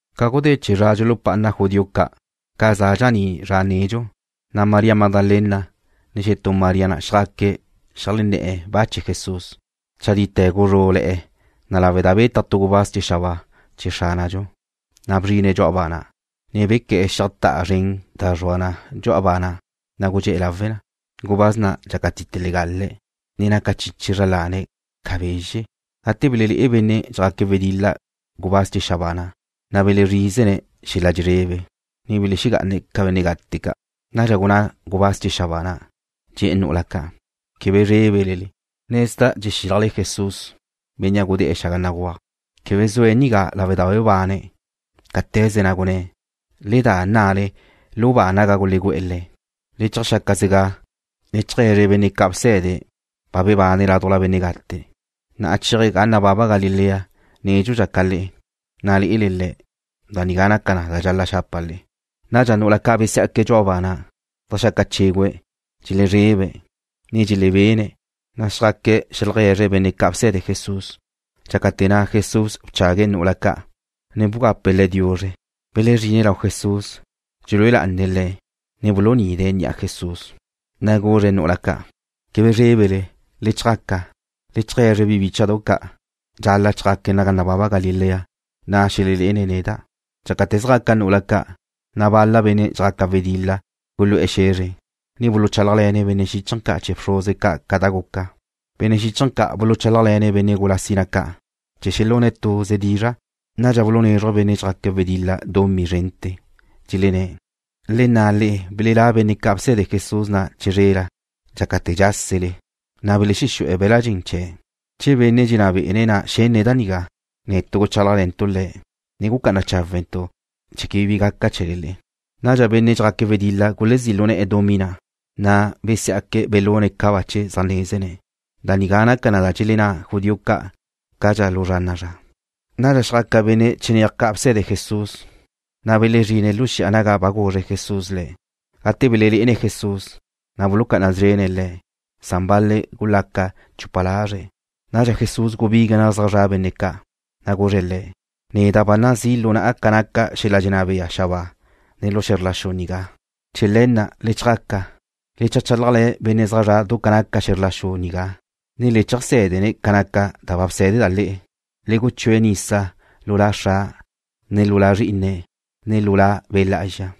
Ca gudé chee̱ zra dxulupá'ana judío ca', ca za dxaní' zra nedxu, na' María Magdalena, ne xetú María na' xjaque̱' xeajlenné̱'e̱ ba chee̱ Jesús. Chadite guzrú'le̱'e̱ na lawe' da betaj tu gubáz chee̱ xabáa chee̱ Xránadxu, na' bzrine̱' dxu'a ba na', ne bequé̱'e̱ xíajta'a zren na' da zrua na dxu'a ba na', na' gudxé'e̱ lawe na. Gubáz na' dxácatite legale̱', ne naca chiche zra lane̱' ca bezxe'. Gate belelé'e benne' dxjaque̱' wedil-la gubáz chee̱ xabáa na', na' belezrízene̱' xel-la' dxelezrebe, ne belexegá'ane̱' ca benne' gate ca'. Nadxa gunná gubáz chee̱ xabáa na', dxe̱'e̱ nu'ula ca': ―Quebe zrébele. Nezda' dxexílajle Jesús, bénnea' gudé̱'e̱ xaga béguaj. Quebe zue̱' nigá lawe' da ba bebane̱', cáte̱ze na' gunné̱'. Le da nna'le lu ba naga gulegú'e̱ Le̱'. Le cheajxáquezega, le cheaje̱zre benne' ca' bsé̱dene̱' ba bebane̱' ládujla benne' gate, na' chéaje̱' ga nababa Galilea nédxudxa ca le'e. Na' lé'ele Le̱'. Da nigá naca na da nabaga'a xapa' le'e. Nadxa nu'ula ca' besiá'que̱' dxu'a ba na', zeajxaca chégüe̱'. Dxelezrebe̱', ne dxelebene̱'. Zjaque̱' zeajlegue̱zre̱' benne' ca' bse̱de Jesús. Dxácate̱ na' Jesús bchague̱' nu'ula ca', ne bgape̱' le̱' diuzre. Belezrine̱' lau Jesús, dxelúe lá'ane̱' Le̱', ne bulunide̱' ni'a Jesús. Le̱' guzre̱' nu'ula ca': ―Quebe zrébele. Le chjaca, le cheajé̱zre bi bícha'dau' ca' dxal-la' chjaque̱' naga nababa Galilea. Na' xelexelé'ene̱' neda'. Dxácate̱ zjaca nu'ula ca', na' benne' ca' dxjaca wedil-la gulu'e̱ xe̱zre, ne buluchálajle̱ne̱' benne' xíchaje̱ ca' chee̱ bxruze ca' ca da guca. Benne' xíchaje̱ ca' buluchálajle̱ne̱' benne' gula sina ca' chee̱ xelune̱' tuze dizra'. Nadxa bulunézruje̱' benne' dxjaque̱' wedil-la dumí zrente̱. Dxelenné̱': ―Le nna le'e belelá' benne' ca' bse̱de Jesús na' chizrela, dxácate̱ dxásele le'e, na' belexexú'e̱ be̱l-la' dxen chee̱'. Che benne' dxenná be̱'e̱ na' xenne̱' da nigá, netu' guchálajle̱ntu' le̱', ne gucá'ana cháwentu' chee̱ quebe bi gaca chee̱le le'e. Nadxa benne' dxjaque̱' wedil-la gulezí' lu ne̱'e̱ dumí na', na' besiá'que̱' belune̱' ca bache zaj nézene̱'. Da nigá naca na ca dxelenná judío ca' zéajte̱ lu zra na'a zra. Nadxa xjaca benne' chinéaj ca' bse̱de Jesús, na' belezrine̱' lu xi'a naga ba guzre Jesús le̱'. Gate belelé'ene̱' Jesús, na' bulucá'ana szrene̱' Le̱'. Bal-le̱' gulaca chupa lazre̱'. Nadxa Jesús gubigue̱' naga zaj zra' benne' ca', na' guzre̱' le̱': ―Neda' ba nazí' lu na'a ca naca xel-la' dxenná bea xabáa, ne lu xe̱zr la xu nigá. Chee̱ le̱ na' le chjaca, le cheajchálajle̱ benne' zaj zre̱'e̱ du ca naca xe̱zr la xu nigá, ne le cheajsé̱dene̱' ca naca da bsé̱deda' le'e. Le guchúe̱' le̱' nisa lu La Xra', ne lu La Zrí'ine̱', ne lu La Be' Lá'azxa.